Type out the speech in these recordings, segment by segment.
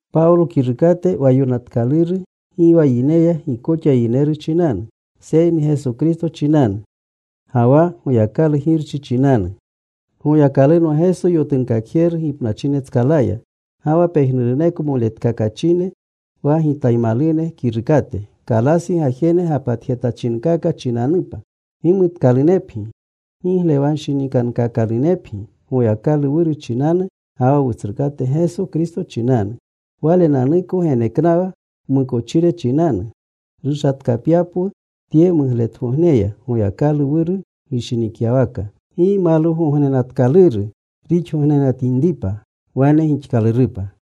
Pawlo kirukate, wa yokanatkaluru, gi wa yineya gi koxa yineru chinanu, seyni Geso Kristo chinanu ga wa Goyakalu Girchi chinanu. Goyakalunwa Geso yotunkakjeru gipnachinetskalaya. Ga wa pejnuruneko moletkakachine wa gitaymalune kirukate. Kalasi gajene gapatjetachinkaka chinanupa. Gimutkalunepgi. Giglewanshinikankaakalunepgi Goyakalu Wuru chinanu ga wa Wutsrukate Geso Kristo chinanu. Walenanuko geneknawa wmukochire chinanu, rushatkapyapwu tye mugletgogneya, Goyakalu Wuru gishinikyawaka. Gimalwugognenatkaluru rixgognenatinripa. Wane gixkalurupa.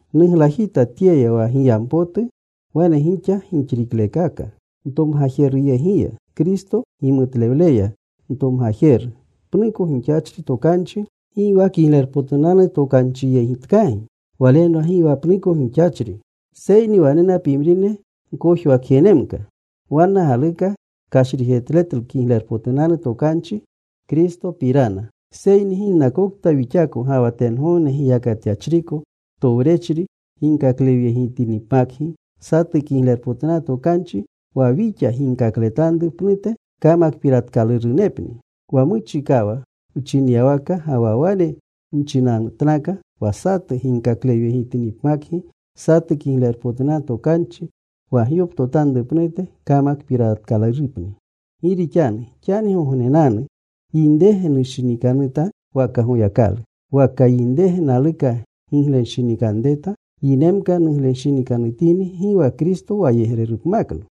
Nuglajita tyeya wa giyampotu wane gixa gixriklekaaka ntomgajeruyegiya, Kristo gimutlewleya ntomgajeru. Pnuko gixachri tokanchi, gi wa Kiglerpotunanu Tokanchiyegitkagi. Walenwa gi wa pnuko gixachri. Seyni wanena pimrine gkojwakjenemka. Wanna galuka kashrijetletlu Kiglerpotunanu Tokanchi Kristopirana. Seyni ginnakokta wixako ga wa tengogne giyakatyachriko towrechri ginkaklewyegitinipmakgi satu Kiglerpotunanu Tokanchi wa wixa ginkakletanru pnute, kamakpiratkalurunepni. Wa muchikawa wchinyawaka, ga wa wane nchinatnaka, wa satu ginkaklewyegitinipmakgi satu Kiglerpotunanu Tokanchi wa gyoptotanru pnute, kamakpiratkalurupni. Gi rixanu ¿xanigognenanu yinrege nushinikanuta waka Goyakalu? Waka ¿yinrege naluka giglenshinikanreta? Yinemka nuglenshinikanutini, gi wa Kristo wayegrerupmakno.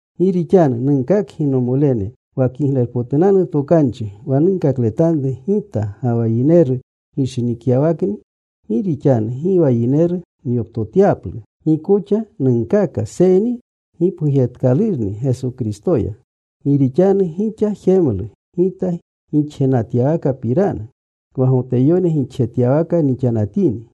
Gi rixanu nunkakgi, nomolene, wa Kiglerpotunanu Tokanchi wa nunkakletanru gita, gi wa yineru gishinikyawakni. Gi rixanu gi wa yineru nyoptotyalu. Gi koxa nunkaaka seyni gipgujetkalurni Geso Kristoya. Gi rixanu gixa jemlu gita gixjenatyawakapirana, wa Goteyone gixjetyawaka nixanatini.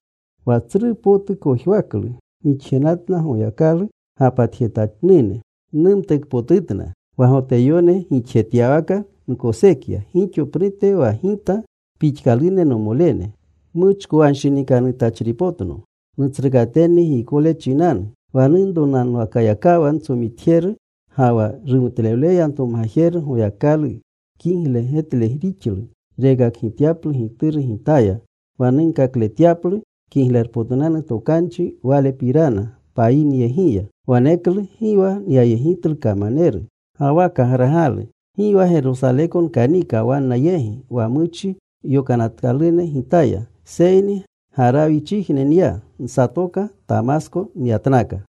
Wa tsru potu kojwaklu nixjenatna Goyakalu gapatjetanune. Numtukpotutna. Wa Goteyone gixjetyawaka nkosekya gixo pnute wa gita pixkalune nomolene. Muchkowanshinikanutachripotno nutsrukatenni giykole chinanu. Wa nunronanwakayakawa ntsomitjeru, ga wa rumutlewleya ntomgajeru Goyakalu kigle getle rixlu rekakgityaplu Gituru gitaya, wa nunkakletyaplu Kiglerpotunanu Tokanchi Walepirana payineyegiya. Waneklu gi wa nyayegitlu kamaneru ga wa kagragalu. Gi wa Gerosaleko nkanika wanna yegi wa muchi yokanatkalune gitaya, seyni Garawichijne nya. Nsatoka. Tamasko nyatnaka.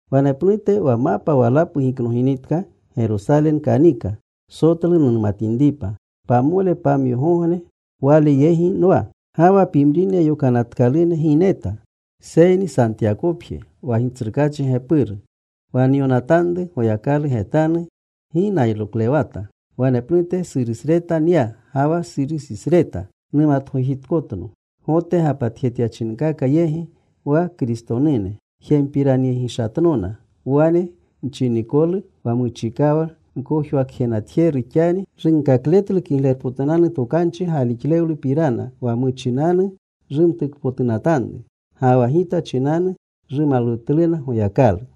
Wanepnute, wa mapa walapu giknoginitka, Gerosale nkanika, Sotlu numatinripa. Pamole pamyogogne wale yegi nwa. Ga wa pimrine yokanatkalune gi neta, seyni Santiyakopje wa Gitsrukaachi gepuru. Wa nyonatanru, Goyakalu getanu, gi nayroklewata. Wanepnute Surisreta nya ga wa Surisisreta. Mumatgojitkotno Gote gapatjetyachinkaka yegi, wa Kristonune. Jempiranyegishatnona wane nchinikolu, “Wa muchikawa wkojwakjejenatjeru, xani runkakletlu Kiglerpotunanu Tokanchi galixlewlupirana wa muchinanu rumtukpotunatanru.” Ga wa gita chinanu rumalwutluna Goyakalu.